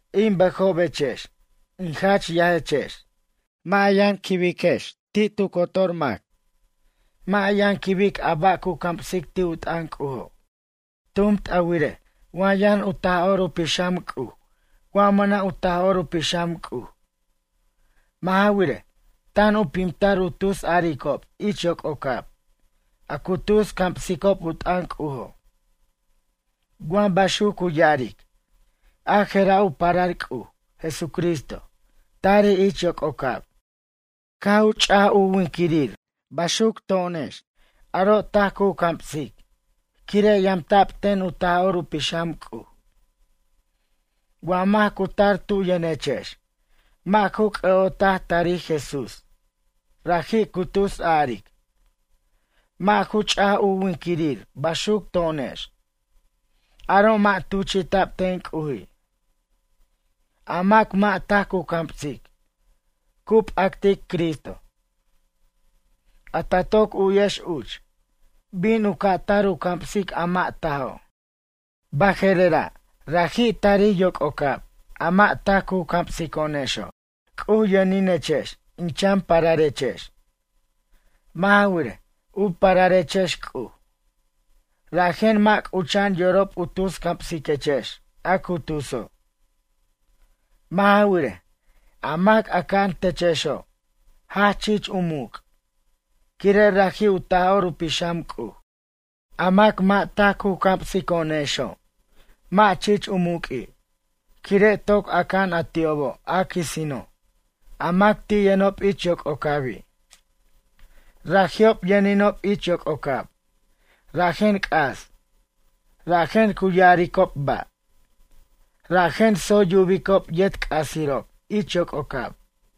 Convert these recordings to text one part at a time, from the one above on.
In bʌjobechex, in jach yajechex, mʌ' a yʌn quibiquechex tu cotor mac. Mʌ' a yʌn quibic a ba' cu camsic ti' u t'ʌn C'ujo'. Tumt a wirej wa yʌn u Taj'or u Pixam C'uj wa mʌna' u Taj'or u Pixam C'uj. Mʌ' ja wirej, tan u pimtar u tus aricob ich yoc'ocab a cu tus camsicob u t'ʌn C'ujo'. Wa baxuc cu ya'aric: “A je'ra' u parar C'uj, Jesucristo, tarij ich yoc'ocab. Caj u ch'aj u winiquirir baxuc to'onex”, aro' taj cu camsic, quire' yamta'b ten u Taj'or u Pixam C'uj. Wa mac cu tar tu yʌnechex mʌ' ju c'ʌ'otaj tarij Jesús, raji' cu tus a'aric: “Mʌ' ju ch'aj u winquirir baxuc to'onex”, aro' mʌ' tuchi'ta'b ten C'uji'. A mac mʌ' taj cu camsic, cu p'actic Cristo. A ta toc u'yex uch: “Bin u ca' tar u camsic a mʌ' tajo'.” Baje'rera' raji' tarij yoc'ocab a mʌ' taj cu camsico'onexo'. C'uj yʌninechex in chan pararechex. Mʌ' ja wirej, u pararechex C'uj. Rajen mʌ' c'ucha'an yorob u tus camsiquechex a cu tuso'. Mʌ' ja wirej, a mac a aca'an techexo', jach chich u muc', quire' raji' u Taj'or u Pixam C'uj. A mac mʌ' taj cu camsico'onexo' mʌ' chich u muq'ui', quire' toc aca'an a ti'obo' a quisino', a mac ti' yʌnob ich yoc'ocabi'. Raji'ob yʌninob ich yoc'ocab rajen c'as. Rajen cu ya'aricob ba'. Rajen tsoy yubicob yet c'asirob ich yoc'ocab.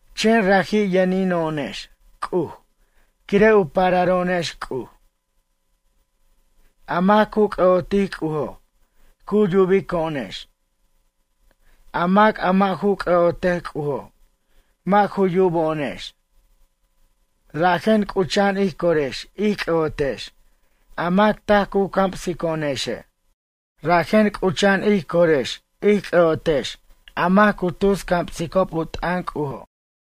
Chen raji' yʌnino'onex C'uj quire' u pararo'onex C'uj. A mac cu c'ʌ'otic C'ujo' cu yubico'onex. A mac a mʌ' ju c'ʌ'otej C'ujo' mʌ' ju yubo'onex. Rajen c'ucha'an ij corex ij c'ʌ'otex a mac taj cu camsico'onexe'. Rajen c'ucha'an ij corex ij c'ʌ'otex a mac cu tus camsicob u t'ʌn C'ujo'.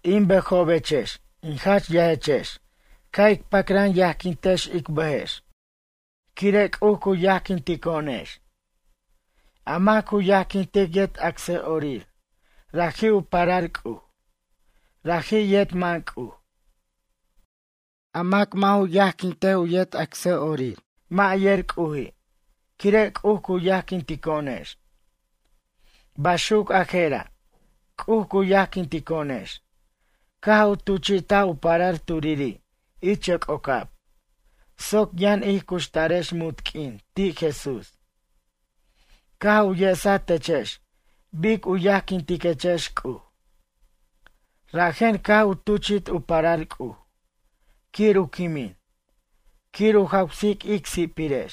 In bʌjobechex in jach yajechex ca' ic pacran yajquintex ic bʌjex, quire' C'uj cu yajquintico'onex. A mac cu yajquintic yet acsʌ'orir, raji' u parar C'uj. Raji' yet man C'uj. A mac mʌ' ju yajquint u yet acsʌ'orir mʌ' yer C'uji' quire' C'uj cu yajquintico'onex. Baxuc a je'ra', C'uj cu yajquintico'onex caj u tuchi'taj u parar turiri' ich yoc'ocab, soc yʌn ij cuxtarex munt q'uin ti' Jesús. Caj u yesaj techex bic u yajquintiquechex C'uj. Rajen caj u tuchi't u parar C'uj, quir u quimin, quir u jawsic ic si'pirex.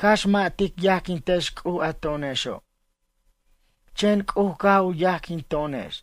Cax mʌ' tic yajquintex C'uj a to'onexo'. Chen C'uj caj u yajquin to'onex.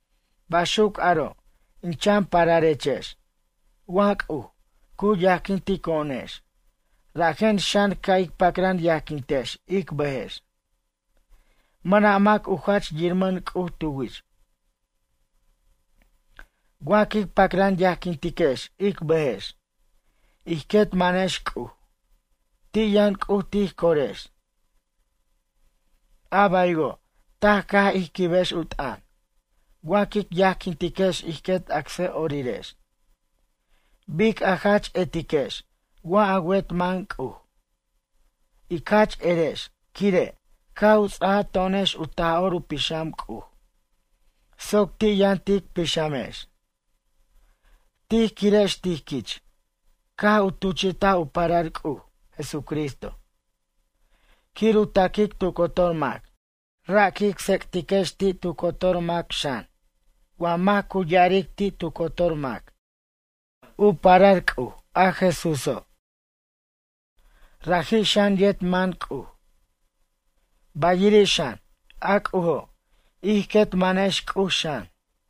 Baxuc aro' in chan pararechex, wa C'uj, cu yajquintico'onex rajen xan ca' ic pacran yajquintex ic bʌjex. Mʌna' mac u jach yirmʌn C'uj tu wich. Wa quic pacran yajquintiquex ic bʌjex. Ij quet manex C'uj, ti' yʌn C'uj tij corex. A baywo', taj caj ij quibex u t'ʌn, wa quic yajquintiquex ij quet acsʌ'orirex. Bic a jach etiquex wa a wet man C'uj? Ic jach erex quire', caj u ts'aj to'onex u Taj'or u Pixam C'uj, soc ti' yʌn tic pixamex. Tij quirex tij quich caj u tuchi'taj u parar C'uj, Jesucristo, quir u taquic tu cotor mac. Ra' quic tsec'tiquex ti' tu cotor mac xan. Wa mac cu ya'aric ti' tu cotor mac: “U parar C'uj, a Jesúso'”, raji' xan yet man C'uj. Bayiri' xan, a C'ujo', ij quet manex C'uj xan.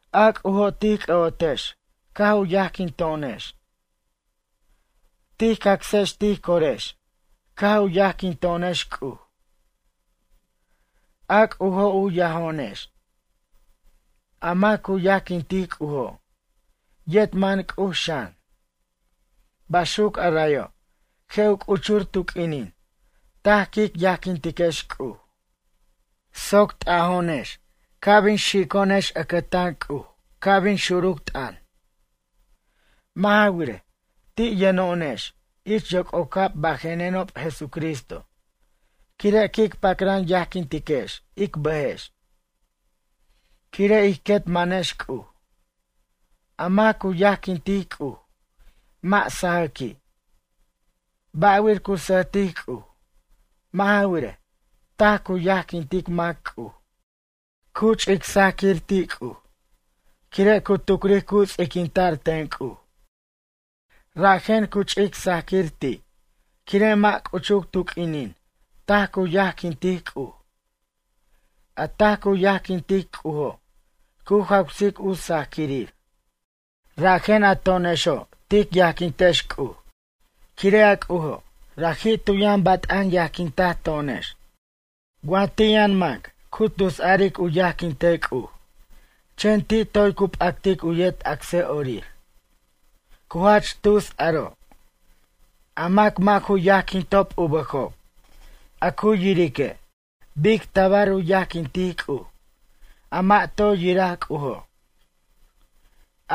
A C'ujo' tij c'ʌ'otex caj u yajquinto'onex. Tij cacsex tij corex caj u yajquinto'onex C'uj. A C'ujo', u yajo'onex. A mac cu yajquintic C'ujo' yet man C'uj xan. Baxuc arayo' je' u c'uchur tu q'uinin taj quic yajquintiquex C'uj. Soc t'ajo'onex ca' bin xico'onex ʌcʌtan C'uj ca' bin xuruc t'ʌn. Mʌ' ja wirej, ti' yʌno'onex ich yoc'ocab bajenob Jesucristo quire' quic pacran yajquintiquex ic bʌjex. Quire' ij quet manex C'uj. A mac cu yajquintic C'uj mʌ' sajʌqui'. Ba'wir cu sʌjtic C'uj? Mʌ' ja wirej, taj cu yajquintic mac C'uj. Cu ch'ic sajquir ti' C'uj quire' cu tucric cu ts'iquinta'r ten C'uj. Rajen cu ch'ic sajquir ti', quire' mʌ' c'uchuc tu q'uinin taj cu yajquintic C'uj. A taj cu yajquintic C'ujo', cu jawsic u sajquirir. Rajen a to'onexo' tic yajquintex C'uj quire' a C'ujo' raji' tu yʌn bat'an yajquintaj to'onex. Wa ti' yʌn mac cu tus aric u yajquintej C'uj, chen ti' toy cu p'actic u yet acsʌ'orir. Cu jach tus aro'. A mac mʌ' ju yajquintob u bʌjob, a cu yirique', bic tabar u yajquintic C'uj, a mʌ' toy yiraj C'ujo'.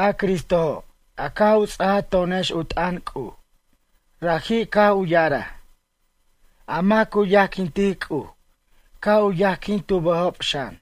A Cristojo' a caj u ts'aj to'onex u t'ʌn C'uj, raji' caj u ya'araj: “A mac cu yajquintic C'uj ca' u yajquin tu bʌjob xan.”